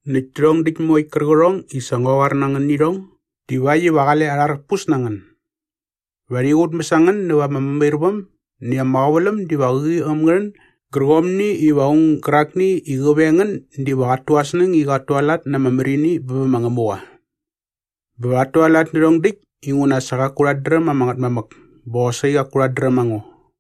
“Näkt tärhong däkt moekt kärqärhong i sa ngua qoar na ngän nä irhong divakt iva qale arharpus na ngän. Va rhi qutmäs a ngän näva ama mämairväm näkt ama qäväläm diva qäqi äm ngä rhän gärqomni iva aung gärakni i qä veng ngän diva qat tu aa snäng i qat tualat na ama märini bä bä ma Ngämuqa. Bä va rhat tualat nä rhärhong däkt inguna sa qaku rhat dräm ama Ngätmamäk bä qosaqi qaku rhat dräm a ngo.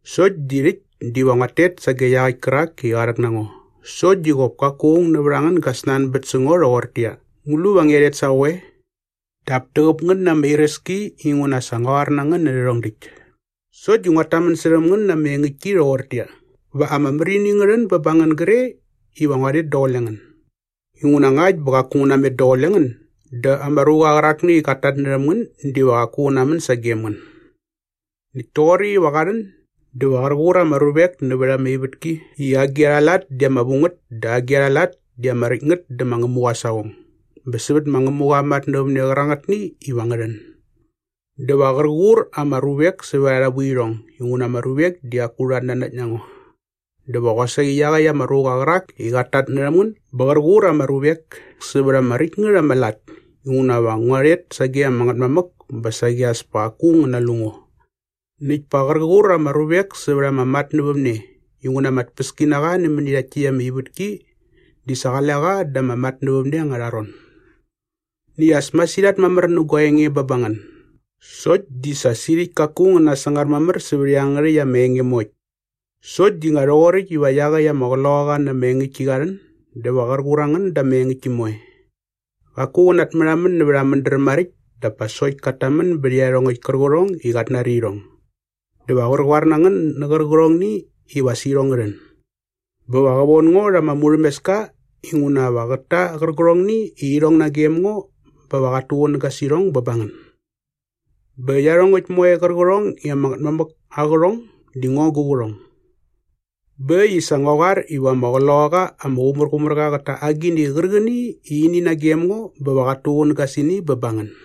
Sokt di rhäkt diva nguat tet sage iaqäkt kärak i qa rhäk na ngo sokt di qop kaku aung nävät a ngän gä snanbät sä ngo rhoqortäqyia, ‘Ngu lu va ngia rhet sa qoe?’ Dap täqäp ngän na ama iräski inguna sa ngua qoar na ngän nä rhärhong däkt. Sokt di nguat tamän särhäm ngän na ama engäktki rhoqortäqyia, va ama märini ngä rhän bä ba ngän gre iva ngua rhet daqule ngän. Inguna ngakt bä qaku ngu namet daqule ngän dä ama ruqa qärakni i qat tatnärhäm ngän diva qaku qä namän sagem ngän. “Näkt toqoräkt iva qa rhän dä va qär qur ama ruvek nävät ama ivätki i agi arha lat di ama vu ngät dä agi arha lat di ama räkt ngät dä ma Ngämuqa aa saqong bä sävät ma Ngämuqa aa matnävämne qärangätni iva ngä rhän. Dä va qär qur ama ruvek sävät arha vuirhong inguna ama ruvek di qaku rhat nanakt na ngo. Dä va qosaqi iaqäkt ama ruqa qärak i qat tatnärhäm ngän ba qär qur ama ruvek sävät ama räkt ngät ama lat inguna va ngua rhet sage ama Ngätmamäk bä saqi as pa qaku ngän nalu ngo. “Näkt pa qär qur ama ruvek sävät ama matnävämne inguna ama tpäskinaqa nämäni rhakt täkt ama ivätki di sa qale qa da ama matnävämne angärha ron. “Näkt as masirhat mamär nä gua enge bä ba ngän sokt di sa sirhäkt kaku ngän nasangar mamär sävät iangärhäkt ama enge moekt. Sokt di nga rhoqoräkt iva iaqäkt ama Qloqaqa na ama engäktki qa rhän dä va qär qur a ngän da ama engäktki moe. Qaku qä natmärhamän nävät aa mädräm maräkt dap pa sokt kat tamän bät iarhongäkt kärqärhong i qat nari irhong. Dä va qär qoar na ngän nä qärqärhongni iva as irhong ngä rhän. Bä va qä von ngo rha ama murhämeska inguna va qät ta qärqärhongni i irhong nagem ngo bä va qat tuqunäga sä irhong bä ba ngän. Bä iarhongäkt moe qärqärhong i ama Ngätmamäk aa qärhong di ngo gu qärhong. Bä äkt i sa ngua qoar iva ama Qloqaqa ama Qumärqumärqa qät ta agini qärqäni i ini nagem ngo bä va qat tuqunäga sä ini bä ba ngän.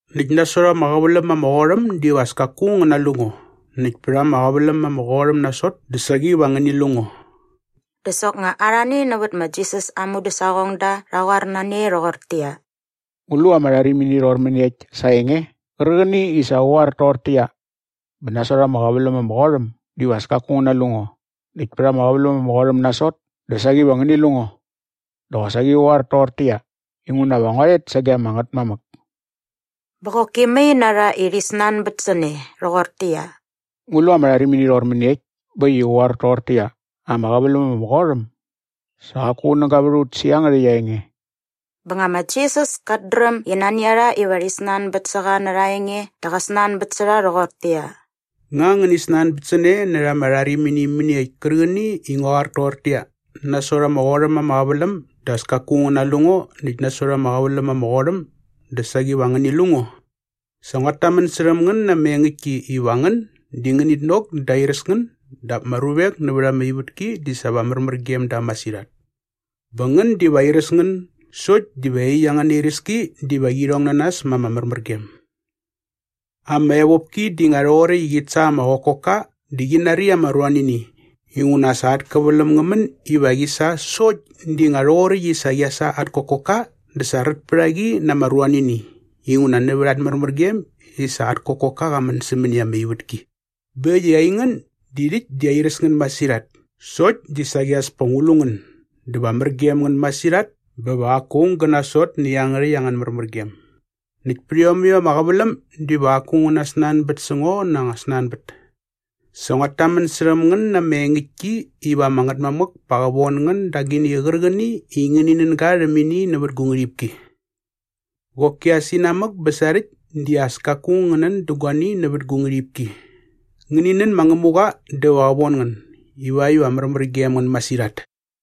“Näkt nasot ama qäväläm ama qot äm diva as kaku ngän nalu ngo näkt pät ama qäväläm ama qot äm nasot dä saqi va ngäni lu ngo.” Dä soknga arhani nävät ma Jisas aa mudäsaqongda rha qoar na ne rhoqortäqyia, “Ngu lu ama rharimini rhoqor mäniekt sa aa enge qärqäni i sa qä qoar toqortäqyia, ‘Bä nasot ama qäväläm ama qot äm diva as kaku ngän nalu ngo näkt pät ama qäväläm ama qot äm nasot dä saqi va ngäni lu ngo’ dä qosaqi qä qoar toqortäqyia, ‘Inguna va ngua rhet sage ama Ngätmamäk’?” Bä qoki mai na rha i rhi snanbät sä ne rhoqortäqyia, “Ngu lu ama rharimini rhoqor mäniekt bä äkt i qä qoar toqortäqyia, ‘ama qäväläm ama qot äm’? Sa qaku qunäga vät a ut sä iangärhäkt aa enge.” Bä nga ma Jisas kat dräm i nani a rha iva rhi snanbät sä qa närha aa enge dä qa snanbät sä rha rhoqortäqyia, “Nga ngäni snanbät sä ne närha ama rharimini mäniekt kärqäni i ngua qoar toqortäqyia, ‘Nasot ama qot äm ama qäväläm dä as kaku ngän nalu ngo näkt nasot ama qäväläm ama qot äm dä saqi va ngäni lu ngo’? Sa nguat tamän särhäm ngän na ama engäktki iva ngän di ngänit nok dä airäs ngän dap ama ruvek nävät ama ivätki di sa va märmär gem da masirhat. Bä ngän diva airäs ngän sokt diva iaqyäkt angäna iräski diva qi rhong na nas ma ama märmärgem. “Ama evopki di nga rhoqoräkt i qit sa ama qokokka dä qi nari ama ruanini inguna sa at käväläm ngä män iva qi sa sokt di nga rhoqoräkt i sa qia sa at kokokka dä sa rät pät a qi na ama ruanini inguna nävät at märmärgem i sa at kokokka qa män sämäni ama ivätki. Bä äkt i aingän di rhäkt di airäs ngän masirhat sokt di saqi as pa ngu lu ngän dä va mär gem ngän masirhat bä va qaku aung gä nasot nä iangärhäkt angän märmärgem. Näkt pät iomäkt ama qäväläm diva qaku ngän nasnanbät sä ngo na anga snanbät. Sa nguat tamän särhäm ngän na ama engäktki iva ama Ngätmamäk pa qä von ngän da agini qärqäni i ngäni nän ga rhäm ini nävät gu ngärhipki. Qoki as inamäk bä sarhäkt di as kaku ngän nän dä guani nävät gu ngärhipki. Ngäni nän ma Ngämuqa dä va qä von ngän ivakt iva märmär gem ngän masirhat.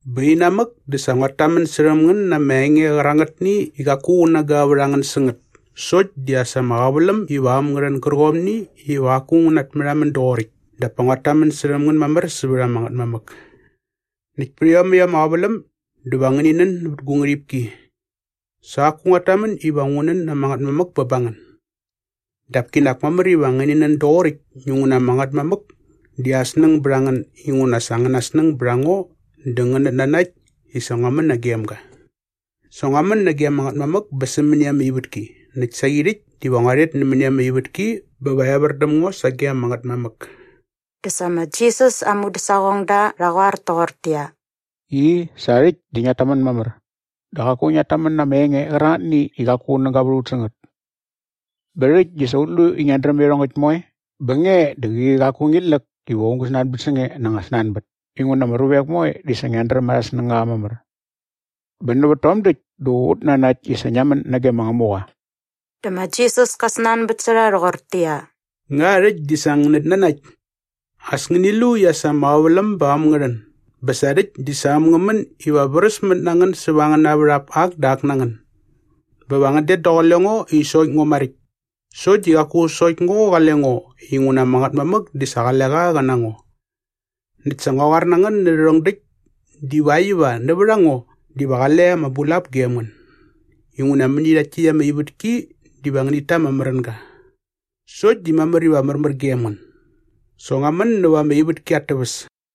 “Bä inamäk dä sa nguat tamän särhäm ngän na ama enge qärangätni i qaku qunäga vät a ngän sä ngät sokt di as ama qäväläm iva äm ngä rhän gärqomni iva qaku ngu natmärhamän doqoräkt dap pa nguat tamän särhäm ngän mamär sävät ama Ngätmamäk. Näkt pät iomäkt ama qäväläm dä va ngäni nän nävät gu ngärhipki. Sa qaku nguat tamän iva ngu nän ama Ngätmamäk bä ba ngän. Dap kinak mamär iva ngäni nän doqoräkt inguna ama Ngätmamäk di aa snäng bät a ngän inguna sa angäna snäng bät a ngo dä ngänät nanakt i sa ngua män nagem ga. Sa ngua män nage ama Ngätmamäk bä sämäni ama ivätki näkt saqi rhäkt diva ngua rhet nämäni ama ivätki bä va evär däm ngo sage ama Ngätmamäk.” Dä sa ma Jisas aa mudäsaqongda rha qoar toqortäqyia, “I, sa rhäkt di ngiat tamän mamär dä qaku ngiat tamän na ama enge qärangätni i qaku qunäga vät a ut sä ngät. Bä rhäkt di sa ut lu i ngiat dräm iarhongäkt moe bä nge di qäqi qaku ngit läk iva aung gä snanbät sä nge na anga snanbät inguna ama ruvek moe di sa ngiat dräm arhä snängaqa mamär. Bä nävät tom däkt dä ut nanakt i sa ngia män nage ma Ngämuqa.” Dä ma Jisas ka snanbät sä rha rhoqortäqyia, “Nga rhäkt di sa ngänät nanakt? As ngäni lu i as ama qäväläm ba äm ngä rhän bä sa rhäkt di sa äm ngä män iva vräsmät na ngän bä säva angäna värhap ak dä ak na ngän. Bä va ngän det daqule ngo i sokt ngo maräkt. Sokt di qaku sokt ngo qale ngo inguna ama Ngätmamäk di sa qale qa qä na ngo. Näkt sa ngua qoar na ngän nä rhärhong däkt divakt iva nävät a ngo diva qale ama bulap gem ngän. Inguna mäni rhakt täkt ama ivätki diva ngänit ta ama märänga. Sokt di mamär iva märmär gem ngän. Sa ngua män näva ama ivätki at täväs.”